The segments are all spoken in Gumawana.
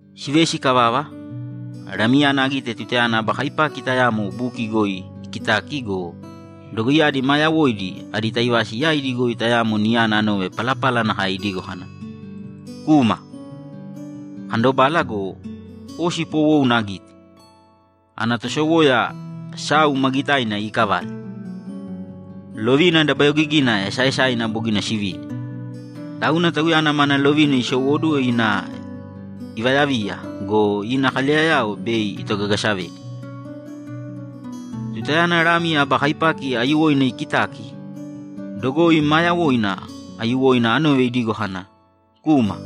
Sivesi ikavava, Lamiyana agite tutayana aba kaipaki tayamo buki goi ikitaki go, dogoiyadi maa yawoidi adi taivasi yaidi goi tayamo niyana anove palapala nakae idigo kana, ‘Kūma!’ Akandobala go, osi poowouna agite, ana tosowoya sau ma gitaina iikavale. Lovina dabayogigina esaaesaina bogina sivini, tauna tauyana mana lovina isowóduwo ina ivayaviya go, ina kaleyayao bei itogagasavedi. Tutayana Lami aba kaipaki aiyuwoina ikitaki, dogoi maa yawoina aiyuwoina anove idigo kana, ‘Kūma!’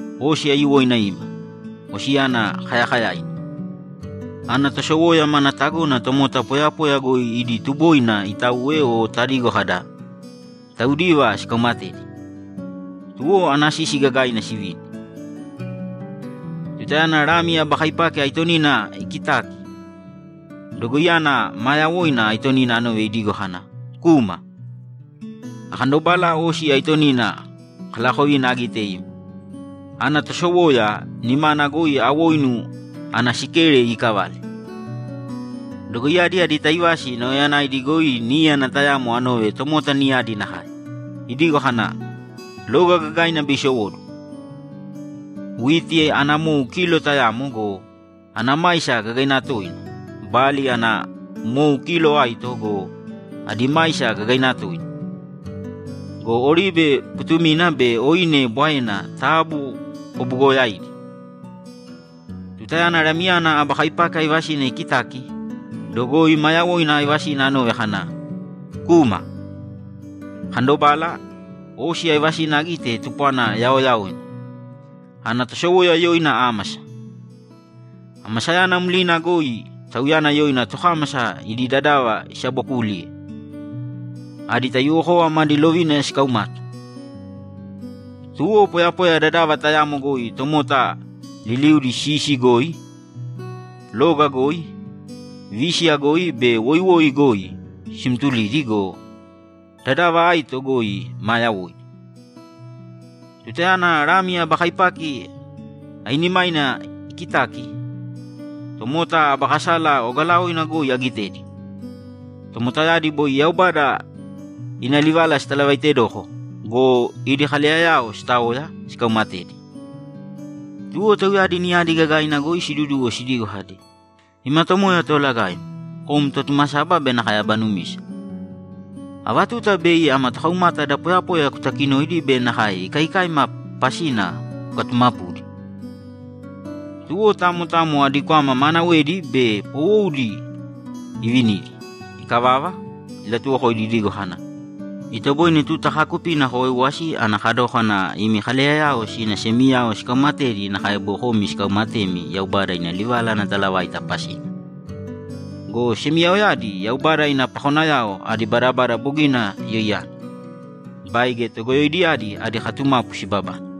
Osi aiyuwoina ima, osiyana kayakayaina. Ana tosowoya mana tagona tomota poyapoya goi idi tuboina itauwe o tadigo kada, ‘Taudiva sikaumatedi.’ Tuwo ana sisi gagaina sivini. Tutayana Lami aba kaipaki aitonina ikitaki, dogoiyana maa yawoina aitonina anove idigo kana, ‘Kūma!’ Akandobala osi aitonina kalaakovina agite ima. Ana tosowoya nimana goi awoinu ana sikere iikavale. Dogoiyadi adi taivasi nauyayanaidi goi níyana tayamo anove tomota niyadi nakae, idigo kana, ‘Loga gagaina bei isowóduwo. Witi ana mou kilo tayamo go, ana maisa gagaina tooina! Bali ana mou kilo aito go, adi maisa gagaina tooina! Go oribe putumina be oine bwaena taabu kubuugoyāidi!’ Tutayana Lamiyana aba kaipaki aivasina ikitaki, dogoi maa yawoina aivasina anove kana, ‘Kūma!’ Akandobala, osi aivasina agite tupwana yaoyaoina. Ana tosowoya yoina Ámasa. Amasayana mlina goi tauyana yoina tokámasa idi dadava isabookuliye. Adi taiyuwokova madi lovina sikaumata. Tuwo poyapoya dadava tayamo goi tomota liliudi sisi goi, loga goi, vísiya goi be woiwoi goi simtulidi go, dadava aito goi maa yawoidi. Tutayana Lami aba kaipaki ainimaina ikitaki, tomota aba kasala ogalaoina goi agitedi. Tomotayadi boi Yaubada ina livala sitalavaitedoko go, idi kaleyayao sitaoya, sikaumatedi. Tuwo tauyadi niyadi gagaina goi siduduwo sidigo kadi, ‘Ima Tomoya Toolagaim, kom Totumasaba be nakae Aba Numisa, ava tuta bei ama tokaumata da poyapoya kutakinoidi be nakae ikaikaima pasina kukatumapudi?’ Tuwo tamo tamo adi kwama maanawedi be poowoudi ivinidi. Ikavava, ilatuwokoidi idigo kana, ‘Itoboine tuta kaakupina kowaiwasi ana kadókana imi kaleyayao sina semiyao sikaumatedi nakae boi komi sikaumatemi Yaubada ina livala ana talavaita pasina. Go semiyaoyadi Yaubada ina pakonayao adi badabada bogina yoiyana, baige togoyoidiyadi adi katumapu sibabane.’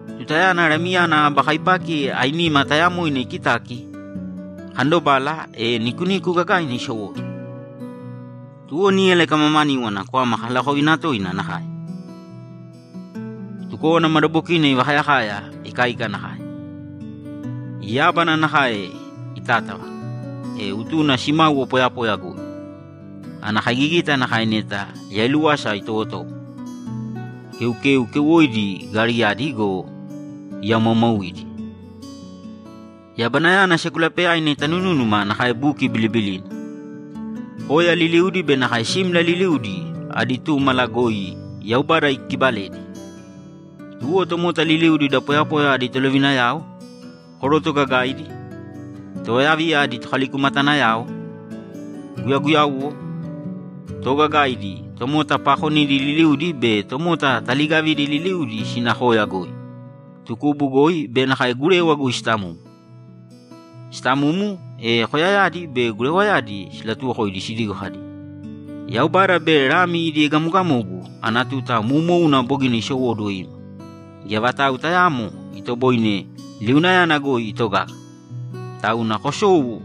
Tutayana Lamiyana aba kaipaki ainima tayamoina ikitaki, akandobala, e nikuniku gagaina isowóduwo. Tuwo níyala ikamamaníwana kwama kalaakovina toina nakae. Tukówana madabokina ivakayakaya ikaika nakae. Yábana nakae itátava, e utuna simáuwo poyapoya goi. Ana kaigigita nakae neta yailúwasa itowotowo, keukeu keuwoidi gariyadi go, iyaomaaumauidi. Yabanayana sekulapeyaina itanunúnuma nakae buki bilibilina. Koya liliudi be nakae simla liliudi adi túmala goi Yaubada ikibaledi. Tuwo tomota liliudi da poyapoya adi tolovinayao, koroto gagaidi, tovayaviya adi tokalikumatanayao, guyaguyauwo, toogagaidi, tomota paakonidi liliudi be tomota taliigavidi liliudi sina koya goi, tukubu goi be nakae gurewa goi sitamumu. Sitamumu, e koyayadi be gurewayadi silatuwokoidi sidigo kadi, ‘Yaubada be Lami idi egamogamogu ana tuta moumouna bogina isowóduwo ima. Geya vatau tayaamo itoboine liunayana goi itogaga, tauna kosōu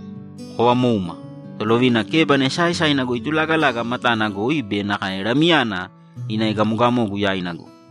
kovamōuma Tolovina kebana esaaesaina goi itulaagalaga matana goi be nakae Lamiyana ina egamogamogu yaina goi.’